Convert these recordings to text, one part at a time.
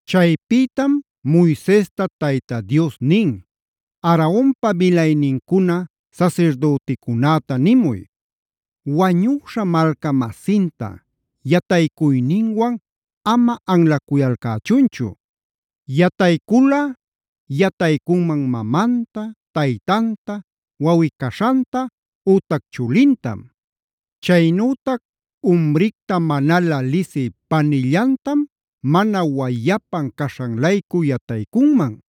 Chaypïtam Moisesta Tayta Dios nin: “Aaronpa milaynincuna sasirdüticunäta nimuy: Wañüśha malca-masinta yataycuyninwan ama anlacuyalcächunchu. Yatayculꞌa yataycunman mamanta, taytanta, wawꞌi-caśhanta ütac chulintam. Chaynütac umricta manalä lisï panillantam, mana wayapan caśhan-laycu yataycunman.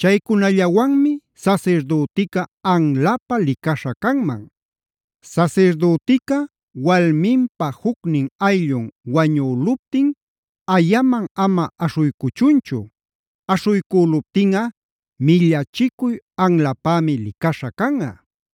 Chaycunallawanmi sasirdütica anlapä licaśha canman. Sasirdütica walminpa jucnin ayllun wañüluptin ayaman ama aśhuycuchunchu; aśhuycüluptinꞌa millachicuy anlapämi licaśha canꞌa.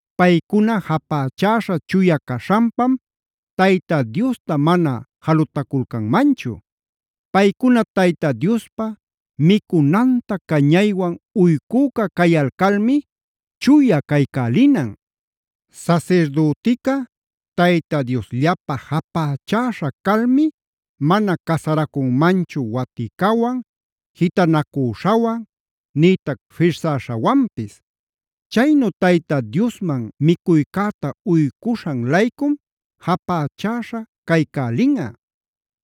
Paycuna japächaśha chuya caśhanpam Tayta Diosta mana jalutaculcanmanchu. Paycuna Tayta Diospa micunanta cañaywan uycüca cayalcalmi chuya caycälinan. “Sasirdütica Tayta Diosllapä japächäśha calmi mana casaracunmanchu waticawan, jitanacüśhawan nïtac firsäśhawanpis. Chaynu Tayta Diosman micuycäta uycuśhan-laycum japächäśha caycälinꞌa.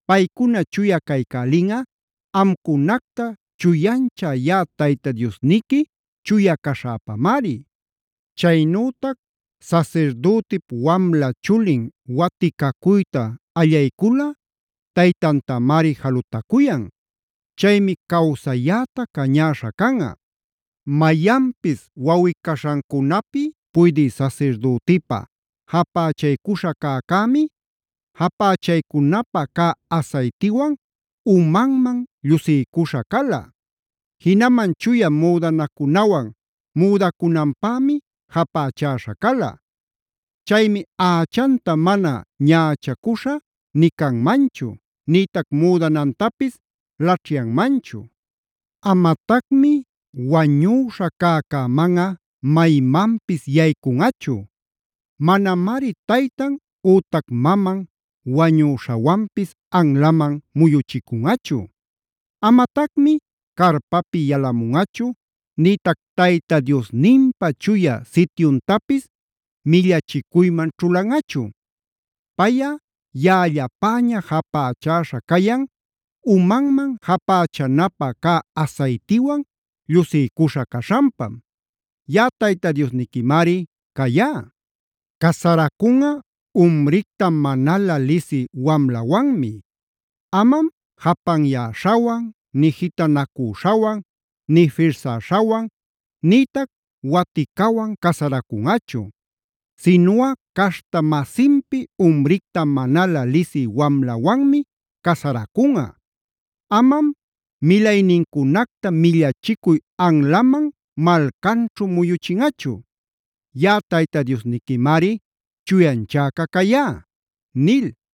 Paycuna chuya caycälinꞌa amcunacta chuyanchä yaꞌa Tayta Diosniqui chuya caśhäpamari. “Chaynütac sasirdütip wamla chulin waticacuyta allayculꞌa taytantamari jalutacuyan. Chaymi cawsayäta cañäśha canꞌa. “Mayanpis wawꞌi-caśhancunapi puydï sasirdütipa japächaycuśha cäcämi, japächaycunapä cä asaytiwan umanman llusiycuśha cala. Jinaman chuya müdanacunawan müdacunanpämi japächäśha cala. Chaymi ächanta mana ñächacuśhä nï canmanchu, nïtac müdanantapis laćhyanmanchu. Amatacmi wañüśha cäcämanꞌa maymanpis yaycunꞌachu. Manamari taytan ütac maman wañüśhawanpis anlaman muyuchicunꞌachu. Amatacmi carpapi yalamunꞌachu nïtac Tayta Diosninpä Chuya Sityuntapis millachicuyman ćhulanꞌachu. Payꞌa yaꞌallapäña japächäśha cayan umanman japächanapä cä asaytiwan llusiycuśha caśhanpam. Yaꞌa Tayta Diosniquimari cayá. “Casaracunꞌa umricta manalä lisï wamlawanmi. Amam japanyäśhawan, nï jitanacüśhawan, nï firsäśhawan, nïtac waticawanb casaracunꞌachu. Sinuꞌa caśhta-masinpi umricta manalä lisï wamlawanmi casaracunꞌa. Amam milaynincunacta millachicuy anlaman malcanćhu muyuchinꞌachu. Yaꞌa Tayta Diosniquimari chuyanchäca cayá” nil.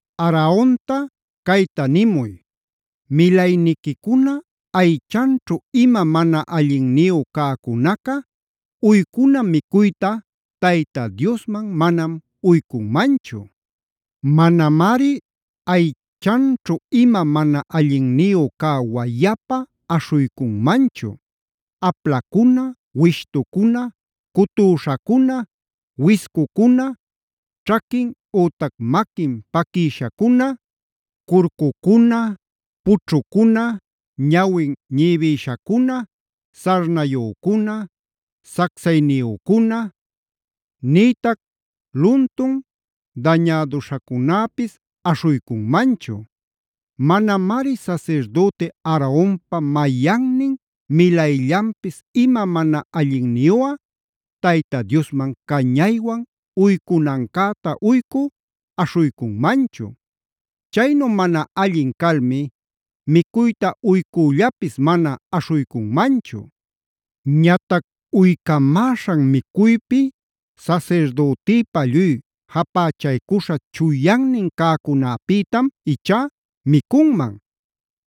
“Aaronta cayta nimuy: Milayniquicuna aychanćhu ima mana allinniyu cäcunaca uycuna micuyta Tayta Diosman manam uycunmanchu. Manamari aychanćhu ima mana allinniyu cä wayapa aśhuycunmanchu: aplacuna, wishtucuna, cutüśhacuna, wiscucuna, ćhaquin ütac maquin paquïshacuna, curcucuna, pućhucuna, ñawin ñibïshacuna, sarnayücuna, sacsayniyücuna, nïtac luntun dañäduśhacunäpis aśhuycunmanchu. Manamari sasirdüti Aaronpa mayannin milayllanpis ima mana allinniyuꞌa Tayta Diosman cañaywan uycunancäta uycü aśhuycunmanchu. Chaynu mana allin calmi micuyta uycüllapis mana aśhuycunmanchu. Ñatac uycamäśhan micuypi, sasirdütïpa lluy japächaycuśha chuyannin cäcunäpïtam ichá micunman.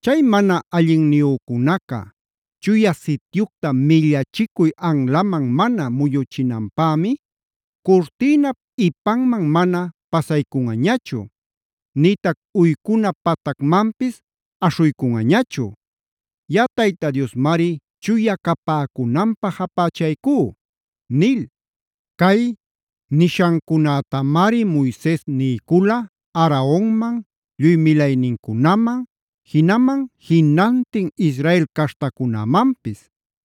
Chay mana allinniyücunaca Chuya Sityucta millachicuy anlaman mana muyuchinanpämi curtïnap ipanman mana pasaycunꞌañachu, nïtac uycuna patacmanpis aśhuycunꞌañachu. Yaꞌa Tayta Diosmari chuya capäcunanpä japächaycú” nil. Cay nishancunätamari Moises niycula Aaronman, lluy milaynincunaman, jinaman jinantin Israel caśhtacunämanpis.